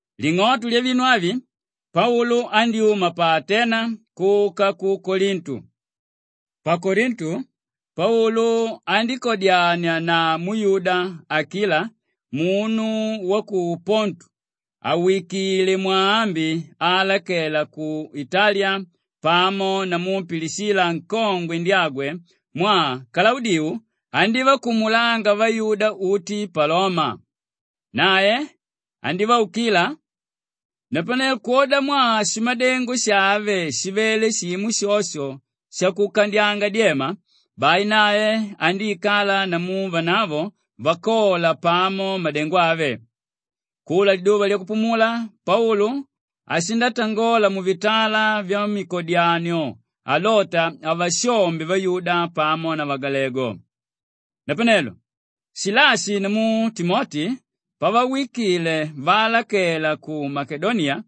Ling'oto lyavinu avi, Paulu andyúma pa Atena kuka ku Kolintu. Pa Kolintu, Paulu andíkadyania na muyuda Akila munu wa ku Pontu àwikile mwaambi aalakela ku Italiya pamo namu Pilishila nkongwe ndyagwe mwaa Kalaudiu andívakumulanga vayuda uti pa Loma. Nae andívaukila napanelo kwodamwaa shimadengo shave shivele shimo shosho shakukandyanga dyema, bai nae andíikala namu vanavo vakola pamo madengo ave. Kula liduva lyakupumula Paulu ashindatangola muvitala vyamikodyanio alota avashombe vayuda pamo na vagalegu. Napanelo Shilashi namu Timoti pavawikile vaalakela ku Makedoniya,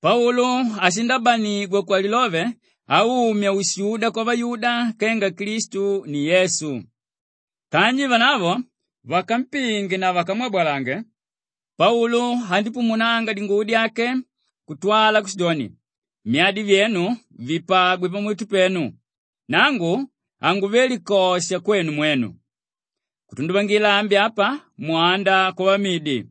Paulu ashindabanigwa kwalilove aumya ushuda kwavayuda kenga Klistu ni Yesu. Kanji vanavo vakampinge na vakamwabalange, Paulu andípumunanga dinguvo dyake kutwala kushidoni, “Myadi vyenu vipagwe pamuti penu! Nangu hanguve likosha kwenu mwenu. Kutunduvangila ambi apa, mwanda kwavamidi.”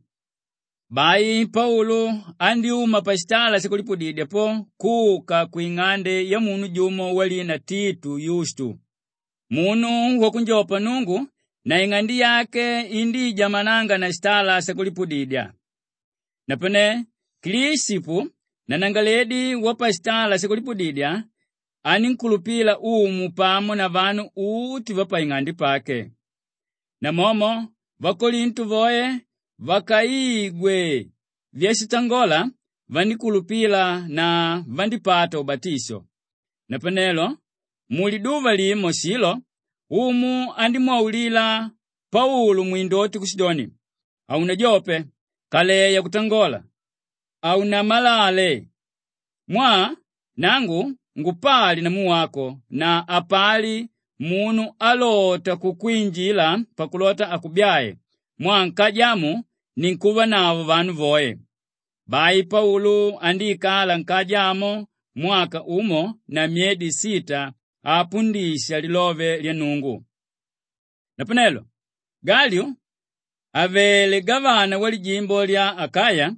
Bai Paulu andyúma pashitala shakulipudidya po kuka kwing'ande yamunu jumo walina Titu Yustu, munu wakunjopa Nnungu na ing'ande yake indíijamananga na shitala shakulipudidya. Napane Klishipu nanangalaledi wapashitala shakulipudidya anínkulupila Umu pamo na vanu uti vapaing'ande pake. Namomo vakolintu voe vakaigwe vyashitangola, vandíkulupila na vandípata ubatisho. Napanelo muliduva limo shilo, Umu andímwaulila Paulu mwindoti kushidoni, “Haunajope, kaleya kutangola, haunamalale mwaa nangu ngupali namu wako na hapali munu álota kukwinjila pakulota akubyae mwaa nkaja amu ninkuvanavo vanu voe.” Bai Paulu andíikala nkaja amo mwaka umo na myedi sita avapundisha lilove lya Nnungu. Napanelo Galyu àvele gavana walijimbo lya Akaya,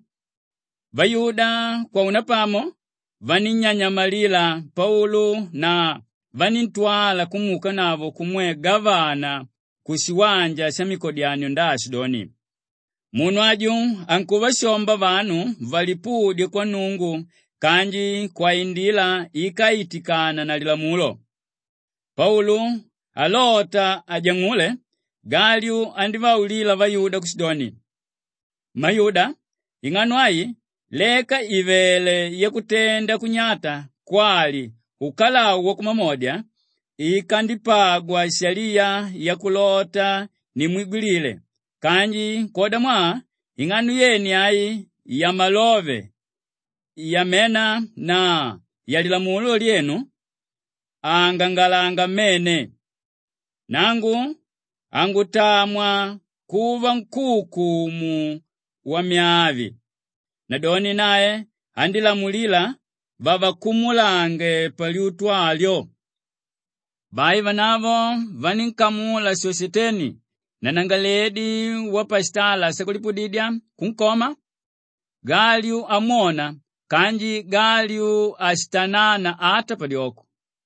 vayuda kwaunapamo vanínnyanyamalila Paulu na vaníntwala kumuukanavo kumwe gavana kushiwanja shamikodyanio ndaashidoni, “Munu aju ankuvashomba vanu valipudye kwa Nnungu kanji kwaindila íkaitikananga na Lilamulo.” Paulu alota ajang'ule, Galyu andívaulila vayuda kushidoni, “Mmayuda, ing'ano ai leka ìvele yakutenda kunyata kwali ukalau wakumamodya, ikandipagwa shaliya yakulota nimwigwilile kanji kwodamwaa ing'ano yene ai yamalove, yamena na yalilamulo lyenu, aangangalanga mmene. Nangu hangutamwa kuva nkúukumu wamyaa avi.” Nadoni nae andílamulila vavakumulange palyutu alyo. Bai vanavo vanínkamula Shoshiteni nanangalaledi wapashitala shakulipudidya kunkoma, Galyu amwona kanji Galyu hashitanana ata padyoko.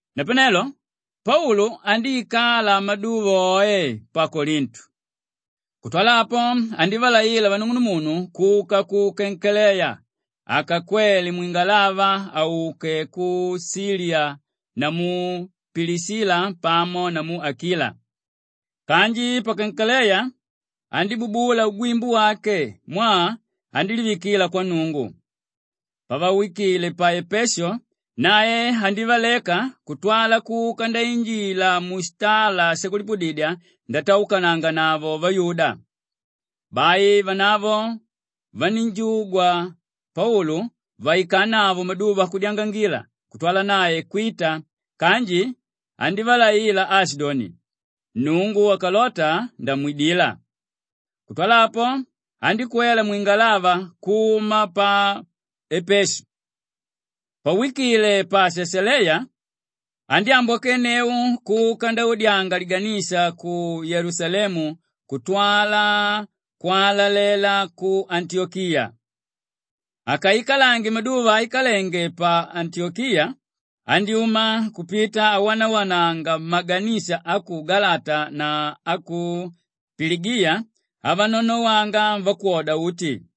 Napanelo Paulu andíikala maduva oe pa Kolintu. Kutwala apo, andívalaila vanung'unumunu kuka ku Kenkeleya akakwele mwingalava auke ku Shiliya namu Pilishila pamo namu Akila. Kanji pa Kenkeleya, andíbubula ugwimbu wake mwaa andílivikila kwa Nnungu. Pavawikile pa Epeshu, nae andívaleka kutwala kuka ndainjila mushitala shakulipudidya ndataukananganavo vayuda. Bai vanavo vanínjugwa Paulu vaikanavo maduva akudyangangila kutwala nae kwita kanji andívalaila aashidoni, “Nnungu akalota ndamwidila.” Kutwala apo, andíkwela mwingalava kuma pa Epeshu. Pawikile pa Shashaleya, andyámbwakenneu kuka ndaudyanga liganisha ku Yelusalemu kutwala kwalalela ku Antiyokiya. Akaikalange maduva aikalenge pa Antiyokiya, andyúma kupita awanawananga mmaganisha a ku Galata na a ku Piligiya avanonowanga vakwoda uti.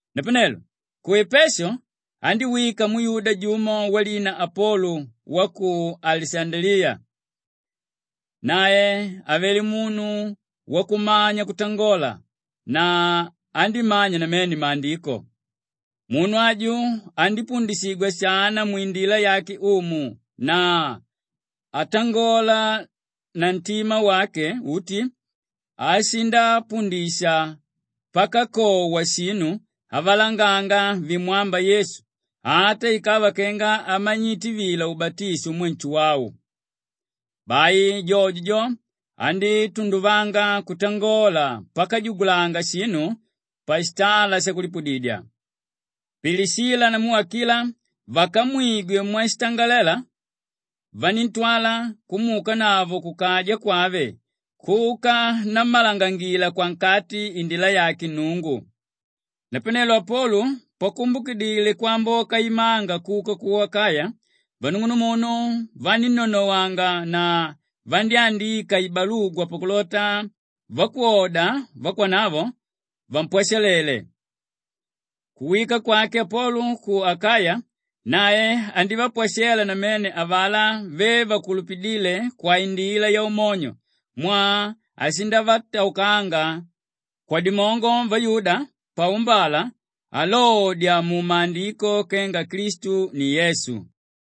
Napanelo ku Epeshu andíwika muyuda jumo walina Apolu wa ku Alishandaliya. Nae avele munu wakumanya kutangola na andímanya namene Maandiko. Munu aju andípundishigwa shana mwindila yake Umu na atangola na ntima wake uti ashindapundisha pakakowa shinu avalanganga vimwámba Yesu ata ikava kenga amanyite vila ubatisho umwe Nshuwau. Bai jojo jo, andítunduvanga kutangola pakajugulanga shinu pashitala shakulipudidya. Pilishila namu Akila vakamwigwe mwashitangalela, vaníntwala kumuukanavo kukaja kwave kuka nammalangangila kwankati indila yake Nnungu. Napanelo Apolu pakumbukidile kwamboka imanga kuka ku Akaya, vanung'unumunu vanínnonowanga na vandyándika ibalugwa pakulota vakwoda vakwanavo, vampwashalele. Kuwika kwake Apolu ku Akaya nae andívapwashela namene avalá ve vakulupidíle kwaindila yaumonyo mwaa ashindavataukanga kwadimongo vayuda paumbala alodya mumaandiko kenga Klistu ni Yesu.